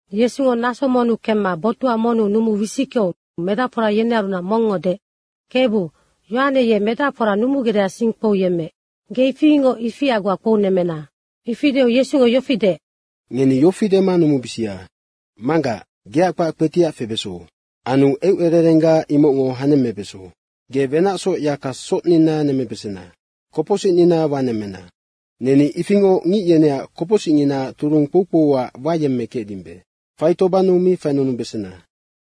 Yesungo naso monnu kemma botuha monnu numuu wisickeu medacfora yenearunac mongngo deec, “Kebu, Yohane ye medacfora numugecdeac sing kpouyemmeec, ge ifingoc ifia goa kpounemmena.” Ifi deu Yesungo yofi deec, “Ngeni yofi dema numubisia, ‘Manggac, geac kpac kpetiac febeso. Anu eucererengga imocngo hanemmebeso. Ge wenacsoc yaka socnina nemmebesena. Kopocsicnina wanemmena. Neni ifingoc ngic yeneac kopocsicnginaac turung kpoukpouac wayemmekecdimbe. Faitobannu mi fainunubesena.’”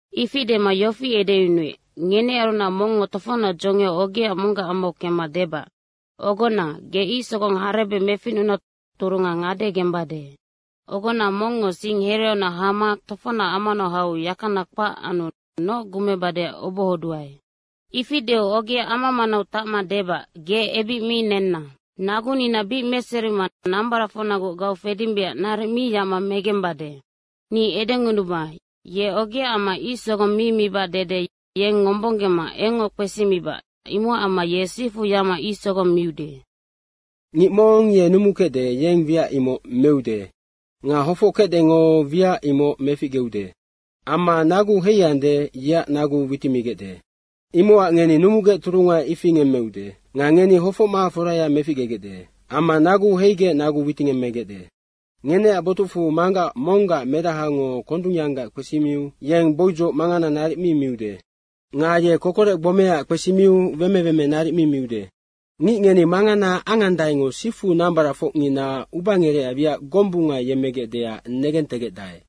Ifi dema yofi edeyunuec, “Ngenearunac mongngo tofocnac dzongiau ogea monggac amau kemma debac, ‘Ogona, ge ic sogong harebec meficnuna turunga ngade gembade. Ogona mongngo sing hereaunac hama tofocnac amanau hau yakana kpac anu noc gumebadeac obohoduae.’ Ifi deu ogea ama manau tacma debac, ‘Ge ebic mi nenna. Nagunina bic meserima nambaracfocnagoc gaufedimbeac naric mi yacma megembade.’ Ni edengunuba, ye ogeaac amma ic sogong mi mibac dede yeng ngombonggema engngoc kpesimibac, imocac amma ye sifu yacma ic sogong miude. Ngic mong ye numukecde, yeng wiac imoc meude nga hofockecdengo wiac imoc meficgeude amma naguu heiande, yeac nagu witimigecde. Imocac ngeni numugec turunga ifi ngemmeude nga ngeni hofocma foraya meficgegecde amma naguu heigec nagu witingemmegecde. Ngeneac botucfu manggac monggac medahango kondungyanggac kpesimiu yeng boidzoc mangana naric mi miude. Nga ye kokorec gbomeaac kpesimiu weme weme naric mi miude. Ngic ngeni mangana angandaengo sifu nambaracfocngina ubangerecac wiac gombunga yemmegecdeac negentegecdae.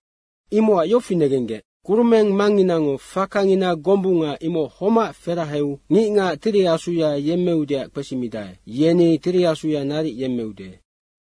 Imocac yofi negenggec, kurumeng Mangnginango fakangina gombunga imoc homac feraheu ngicngac Tiri Asuya yemmeudeac kpesimidae, yeni Tiri Asuya naric yemmeude.”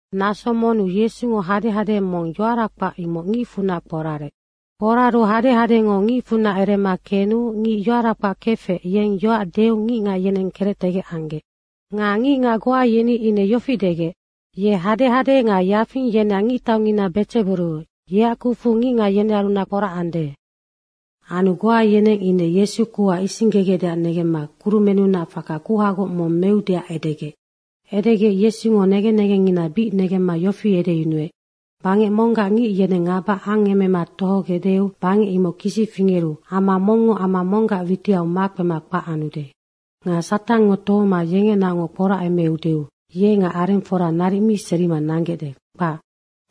Naso monnu Yesungo hadehade mong yoara kpac, imoc ngicfunac kporarec. Kporaru hadehadengo ngicfunac erema kenu ngic yoara kpac kefec, yeng yoac deu ngicngac yeneng kerectegec anggec. Nga ngicngac goa yeni ine yofi degec, “Ye hadehade nga yafing yeneac ngictaungina Bedzeburu yeac kucfu ngicngac yenearunac kporacande.” Anu goa yeneng ine Yesu kuha isinggegecdeac negemma kurumennunac faka kuhagoc mong meudeac edegec. Edegec Yesungo negen negengngina bic negemma yofi edeyunuec, “Bangec monggac ngic yeneng ngaba angemema tohogecdeu bangec imoc kisi fingeru ama mongngo ama monggac witiau makpema kpac anude. Nga Satangngo tohoma yengenaocngoc kporacemeudeu ye nga arengfora naric mi serima nanggecde, kpac.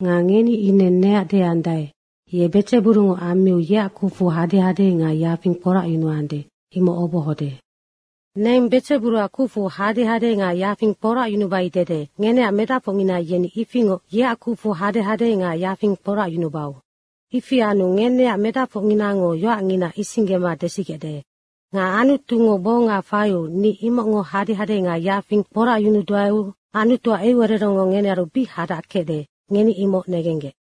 Nga ngeni neac ine deandae, ‘Ye Bedzeburungo ammiu yeac kucfu hadehade nga yafing kporacyunuande, imoc obohode.’ Neng Bedzeburuac kucfu hadehade nga yafing kporacyunubai dede ngeneac medacfocngina yeni ifingoc yeac kucfu hadehade nga yafing kporacyunubau. Ifi anu ngeneac medacfocnginango yoacngina isinggema desigecde. Nga Anutungo gbonga faiu ni imocngo hadehade nga yafing kporacyunuduaeu Anutuac eucererengngo ngenearu bic hadac kecde, ngeni imoc negenggec.”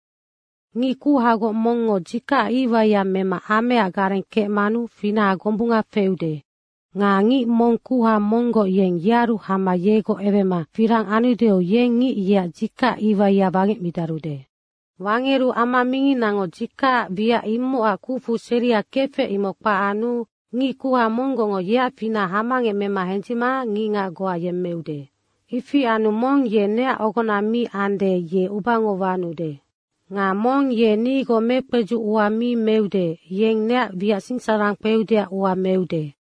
“Ngic kuhagoc mongngo dzikacac iwaiya mema ameaac gareng kecmanu finaha gombunga feude. Nga ngic mong kuha monggoc, yeng yearu hama yegoc ewema firang anudeu yeng ngic yeac dzikacac iwaia wangecmidarude. Wangeru ama minginango dzikac wiac, imocac kucfu seria kefec, imoc kpac anu ngic kuha monggocngo yeac finaha hamangec mema hendzicma ngicngac goa yemmeude. Ifi anu mong ye neac ogona mi ande, ye ubeango wanude. Nga mong ye nigoc mekpedzuc ua mi meude, yeng neac wiac sinsararang kpeudeac ua meude.”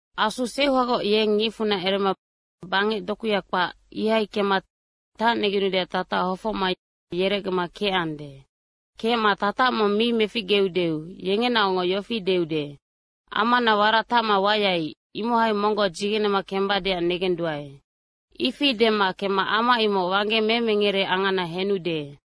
“Asu seuhagoc yeng ngicfunac erema bangec dokuya kpac, ihai kemma tacnegenudeac tatac hofocma yerecgema kecande. Kecma tatac mong mi meficgeudeu yengenaocngoc yofi deude, ‘Amana warac tacma wayai, imohai monggoc dzigenema kembadeac negenduae.’ Ifi dema kemma ama imoc wangge memengere angana henude.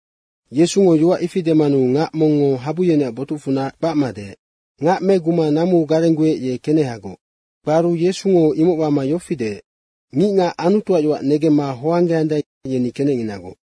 Yesungo yoac ifi demanu ngac mongngo habu yeneac botucfunac kpacma deec, “Ngac meguma namuu garengguec, ye kenehagoc.” Kparu Yesungo imoc wama yofi deec, “Ngicngac Anutuac yoac negemma hoanggeandae, yeni kenecnginagoc.”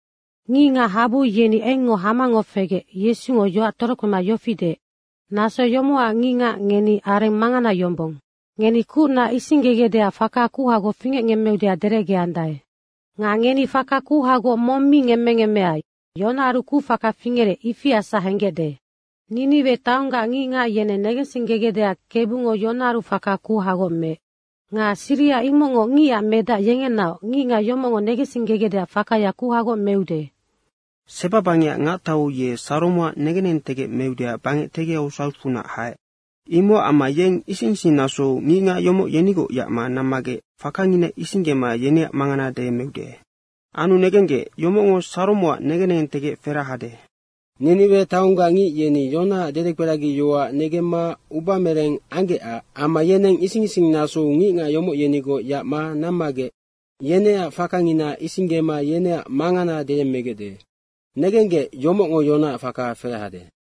Ngicngac habu yeni engngoc hamangoc fegec Yesungo yoac torokpema yofi deec, “Naso yomocac ngicngac ngeni areng mangana yombong. Ngeni kucna isinggegecdeac faka kuhagoc fingecngemmeudeac derecgeandae. Nga ngeni faka kuhagoc mong mi ngemmengemmea, Yonaaru kucfaka fingerec, ifiasac henggecde. Niniwe taonggac ngicngac yeneng negensinggegecdeac Kebungo Yonaaru faka kuhagoc meec. Nga siriha imocngoc Ngicac Medac yengenaoc ngicngac yomocngo negensinggegecdeac fakaya kuhagoc meude. Seba bangecac ngactau ye Saromoac negen negentegec meudeac bangec tegiau sautfunac haec. Imocac amma yeng ising ising nasou ngicngac yomoc yenigoc yacma nammagec fakangina isinggema yeneac mangana deyemmeude. Anu negenggec, yomocngo Saromoac negen negeng ferahade. Niniwe taonggac ngic yeni Yonaac dedekperagiyoac negemma ubamereng anggecac amma yeneng ising ising nasou ngicngac yomoc yenigoc yacma nammagec yeneac fakangina isinggema yeneac mangana deyemmegecde. Negenggec, yomocngo Yonaac faka ferahade.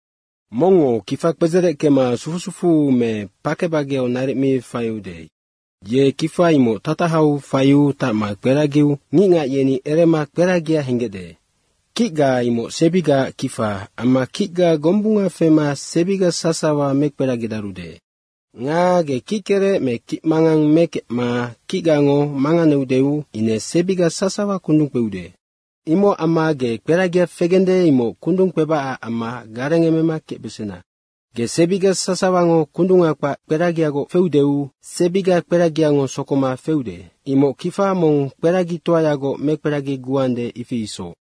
Mongngo kifa kpedzereckema sufu sufuu me pake bageau naric mi faiude, ye kifa imoc tatahau faiu tacma kperagiu ngicngac yeni erema kperagia henggecde. Kicga imoc sebigaac kifa amma kicga gombunga fema sebiga sasawa mekperagidarude. Nga ge kickerec me kicmangang mekecma kicgango manganeudeu ine sebiga sasawa kundung kpeude. Imocac amma ge kperagia fegende, imoc kundung kpebacac amma garengemema kecbesena. Ge sebiga sasawango kundunga kpac kperagigoc feudeu sebiga kperagiango sokoma feude. Imoc kifa mong kperagitoayagoc mekperagiguande, ifi isoc.”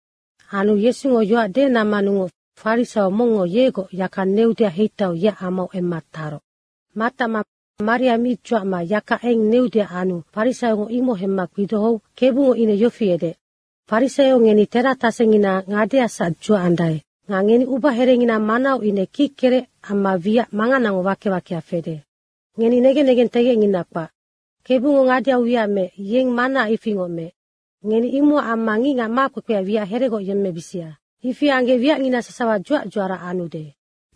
Anu Yesungo yoac demanungoc farisaio mongngo yegoc yaka neudeac heitaiu yeac amau emma taroc. Matacma maria mi dzuacma yaka eng neudeac anu farisaiongo imoc hemma kpidohou Kebungo ine yofi edeec, “Farisaio ngeni teratasengina ngadeasac dzuacandae nga ngeni ubaherengina manau ine kickerec amma wiac manganango wake wakea fede. Ngeni negen negengtegecngina kpac. Kebungo ngadeau wiac meec, yeng manaac ifingoc meec. Ngeni imocac amma ngicngac makpekpea wiac heregoc yemmebisia. Ifi anggec wiacngina sasawa dzuac dzuara anude.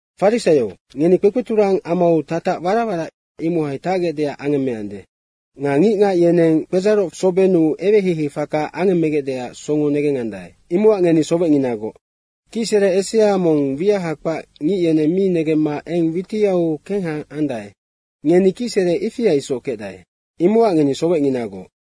Farisaio, ngeni kpekpeturang amau tatac warac warac imohai tacgecdeac angemmeande nga ngicngac yeneng kpedzaroc sobennu eweheihei faka angemmegecdeac songo negengandae, imocac ngeni sowecnginagoc. Kicsere esea mong wiaha kpac ngic yeneng mi negemma eng witiau kengha andae, ngeni kicsere ifia isoc kecdae, imocac ngeni sowecnginagoc.”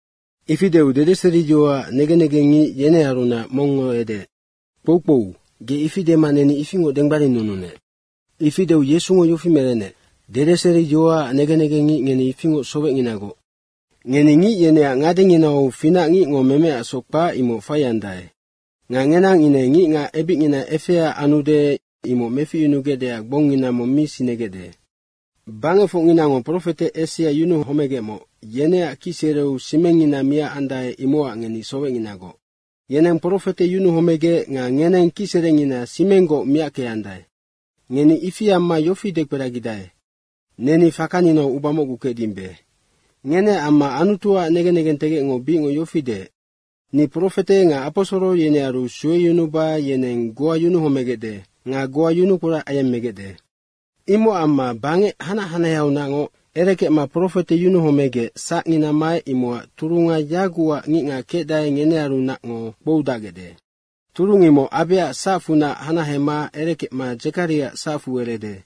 Ifi deu dedeseriyoacac negen negengngic yenearunac mongngo edeec, “Kpoukpou, ge ifi dema neni ifingoc denggbarinnununec.” Ifi deu Yesungo yofi merenec, “Dedeseriyoacac negen negengngic, ngeni ifingoc sowecnginagoc. Ngeni ngic yeneac ngadenginau finac ngicngo memeacsoc kpac, imoc faiandae nga ngenang ine ngicngac ebicngina efea anude, imoc meficyunugecdeac gbongngina mong mi sinegecde. Bangecfocnginango profete esea yunuhomegec homegecmoc yeneac kicsereu simengngina miacandae, imocac ngeni sowecnginagoc. Yeneng profete yunuhomegec nga ngeneng kicserengina simenggoc miackeandae, ngeni ifi amma yofi dekperagidae, ‘Neni fakaninau uba mocgu kecdimbe.’ Ngeneac amma Anutuac negen negentegecngo bicngoc yofi deec, ‘Ni profete nga aposoro yenearu sueyunuba yeneng goa yunuhomegecde nga goa yunukporac ayemmegecde.’ Imocac amma bangec hanac hanaheaunacngoc erekecma profete yunuhomegec sacngina maec, imocac turunga yagucac ngicngac kecdae, ngenearunacngo kpoudacgecde. Turung imoc Abeac sacfunac hanahema erekecma Dzekariaac sacfu erede.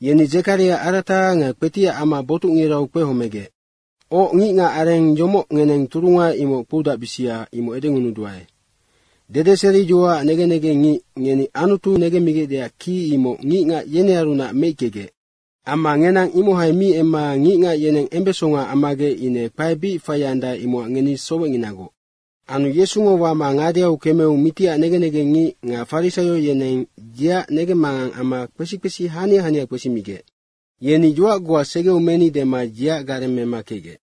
Yeni Dzekaria arata nga kpetiac ama botucngirau kpehomegec. Oc, ngicngac areng yomoc ngeneng turunga imoc kpoudacbisia, imoc edengunuduae. Dedeseriyoacac negen negengngic, ngeni Anutu negemmigecdeac ki, imoc ngicngac yenearunac meickegec. Amma ngenang imohai mi emma ngicngac yeneng embesonga ammagec ine kpae bic faiandae, imocac ngeni sowecnginagoc.” Anu Yesungo wama ngadeau kemeu mitiac negen negengngic nga farisaio, yeneng yeac negemmangang amma kpesi kpesi hania hania kpesimigec. Yeni, “Yoac goa segeu meni.” dema yeac gareng mema kecgec.